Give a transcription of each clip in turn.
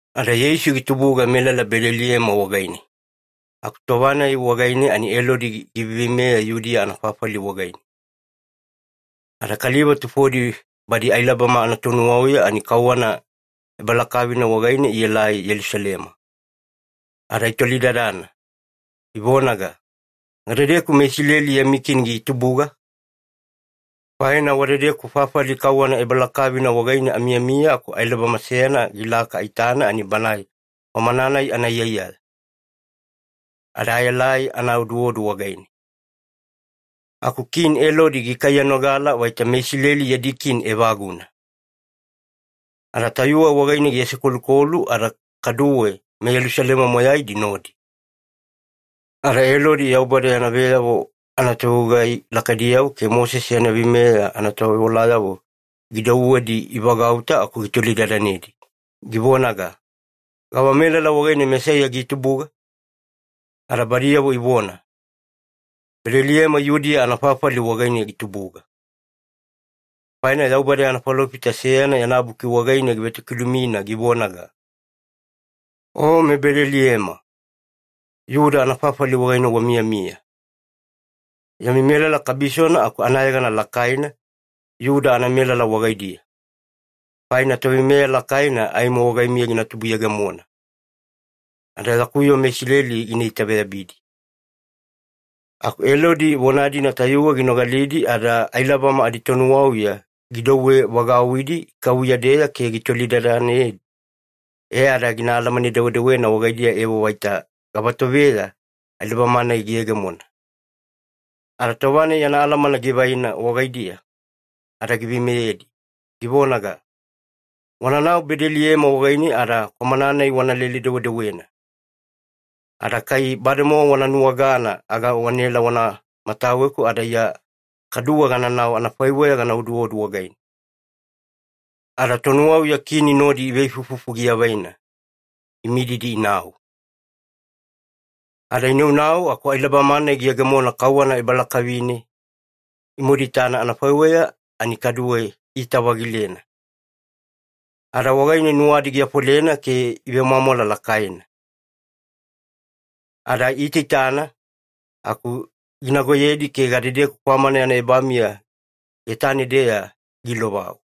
Ada Yeisu gitubuga melala Bedeliema wagaine, aku tova-nai wagaine ani Elodi giveiveimeya Yudiya anafafali wagaine. Ada kaliva tufodi badi ailabama anatonuwauya, ani kauwana ebalakavina wagaine ielai Yelusalema. Ada itolidadana, ivonaga, “Gadedeku meIsileli yami kini gitubuga? Faina wadedeku fafali kauwana ebalakavina wagaine amiyamiya aku ailabama seyana gilaka aitana ani banae kwamana-nai anaiyaiyaya. Ada aelai ana oduodu wagaine.” Aku Kini Elodi gikaiyanogala vaita meIsileli yadi kini evaguna, ada tayuwe wagaine giasekolukolu ada kaduwe meYelusalema moyaidi nodi. Ada Elodi Yaubada yana veyavo anatovegugai lakaidiyavo ke Mosese yana veimeya anatovewalayavo gidouwedi ivagauta aku gitolidadanedi, givonaga, “Gava melala wagaine Mesaiya gina tubuga?” Ada badiyavo ivona, “Bedeliema Yudiya anafafali wagaine gina tubuga, faina Yaubada yana falofita seyana yana buki wagaine givetokilumina givonaga, ‘O meBedeliema, Iyuda anafafali wagaine wamiyamiya. Yami melala kabisona aku anayegana lakaina Iyuda anamelala wagaidiya, faina toveimeya lakaina aimo wagaimiya gina tubuyegemona, ada yaku yoo meIsileli gina itaveyabidi.’” Aku Elodi vona-dina tayuwe ginogalidi, ada ailabama aditonuwauya gidouwevagauwidi ikavuya-deya ke gitolidadanedi, e ada gina alamane-dewedewena wagaidiya evo vaita gavatoveya ailabama-nai giyegemona. Ada tova-nai yana alamana givaina wagaidiya ada giveimeyedi, givonaga, “Wananau Bedeliema wagaine ada kwamana-nai wanalele-dewedewena. Ada kai bademowa wana nuwagana aga wanaela wana mataweku, ada Iya kaduwe gananau anafaiweya gana oduodu wagaine.” Ada tonuwauya Kini nodi iveifuifufu giavaina, imididi inau. Ada inaunau aku ailabama-nai giyegemona kauwana ebalakavine imaduitana anafaiweya, ani kaduwe iita-vagilena, ada wagaine nuwadi giafolena ke ivemwamwala lakaina. Ada iitaitana aku ginagoyedi ke gadedeku kwamana yana ebamiya getane-deya giilovau.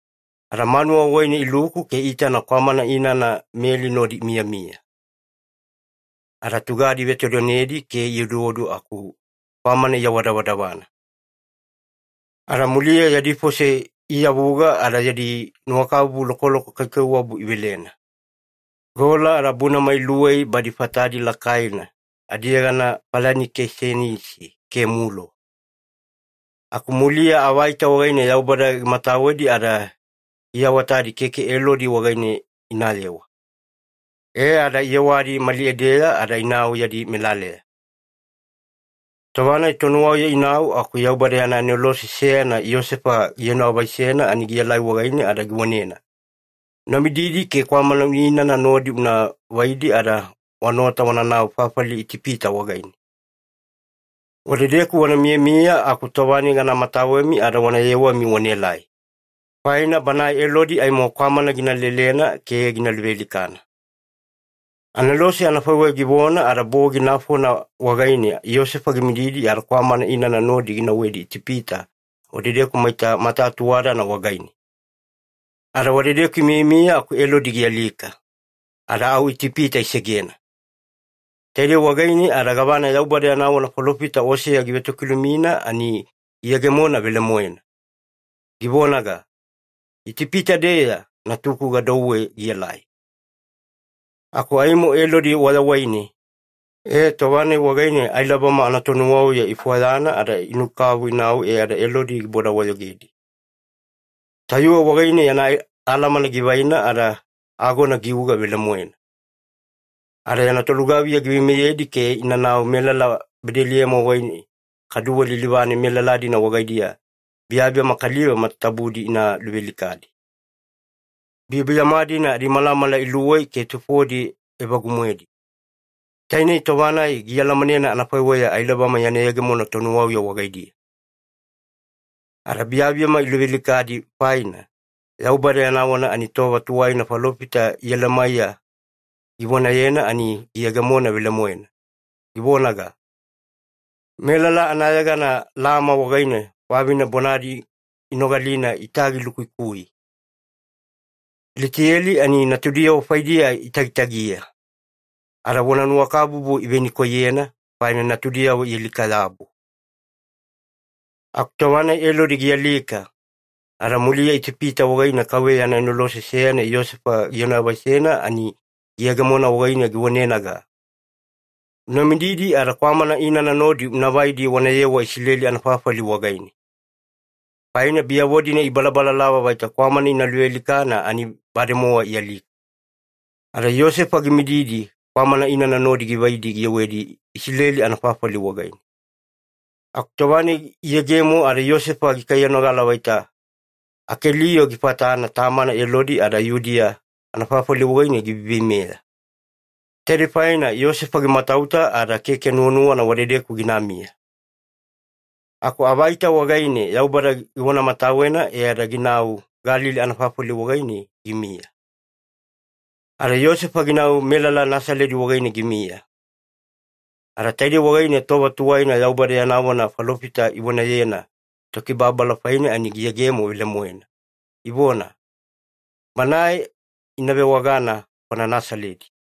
Ada manuwa wagaine iluku ke iitana kwamana inana Meli nodi imiyamiya, ada tugadi ivetodonedi ke ioduodu aku kwamana iawadavadavana. Ada muliya yadi fose iiyavuga ada yadi nuwakabubu lokoloko kaikaiwabu ivelena, gola ada bunama iluwei badi fatadi lakaina adiyegana falanikisenisi ke mulo. Aku muliya avaita wagaine Yaubada gimatawedi ada giawatadi keke Elodi wagaine inayewa, e ada iyewadi mali edeya ada inau yadi melaleya. Tova-nai tonuwauya inau aku Yaubada yana anelose seyana Iyosefa gienoavaisena ani gielai wagaine ada givonena, “Una mididi ke kwamana inana nodi una vaidi ada wanaota wananau fafali Itipita wagaine. Wadedeku wana miyamiya aku tova-nai gana mataweni ada wana yewami wanaelai. Faina banae Elodi aimo kwamana gina lelena ke gina luvealikana.” Anelose anafaiweya givona ada bogi nafona wagaine Iyosefa gimididi ada kwamana inana nodi ginauwedi Itipita, wadedeku maita matatuwadana wagaine. Ada wadedeku imiyamiya aku Elodi gialika, ada au Itipita isegena. Taidei wagaine ada gavana Yaubada yana vona falofita Oseya givetokilumina, ani giyegemona velemoena, givonaga, “Itipita-deya Natuku gadouwe gielai.” Aku aimo Elodi wayawaine, e tova-nai wagaine ailabama anatonuwauya ifwayana ada inukavu inau e ada Elodi giboda-wayogedi. Tayuwe wagaine yana alamana givaina ada agona giuga velemoena. Ada yana tolugaviya giveimeyedi ke inanau melala Bedeliema wagaine, kaduwe lilivane melala-dina wagaidiya biyabiyama kaliva matatabudi ina luvealikadi. Biyabiyama-dina adimalamala iluwei ke tufodi evagu-moedi, tainei tova-nai gialamanena anafaiweya ailabama yana yegemona tonuwauya wagaidiya. Ada biyabiyama iluvealikadi faina, Yaubada yana vona ani tova tuwaina falofita Iyelemaiya givonayena ani giyegemona velemoena, givonaga, “Melala anayegana Lama wagaine vavine bonadi inogalina itagilukuikui. Litiyeli ani natudiyavo faidiya itagitagiya, ada vonanuwakabubu ivenikoiyena, faina natudiyavo ialika-yabu.” Aku tova-nai Elodi gialika, ada muliya Itipita wagaine KAUVEYA yana anelose seyana Iyosefa gienoavaisena ani giyegemona wagaine givonenaga, “Una mididi ada kwamana inana nodi una vaidi wanayewa Isileli anafafali wagaine. Faina biyavo-dina ibalalava vaita kwamana ina luvealikana ani bademowa ialika.” Ada Iyosefa gimididi kwamana inana nodi givaidi giyewedi Isileli anafafali wagaine. Aku tova-nai iyegemo ada Iyosefa gikaiyanogala vaita Akelio gifatana tamana Elodi, ada Yudiya anafafali wagaine giveiveimeya. Taidei faina Iyosefa gimatauta ada keke nuwanuwana wadedeku ginamiya. Aku avaita wagaine Yaubada givonamatawena e ada ginau Galili anafafali wagaine gimiya. Ada Iyosefa ginau melala Nasaledi wagaine gimiya. Ada taidei wagaine tova tuwaina Yaubada yana vona falofita ivonayena Tokibababala faine ani giyegemo velemoena, ivona, “Banae ina vewagana kwana Nasaledi.”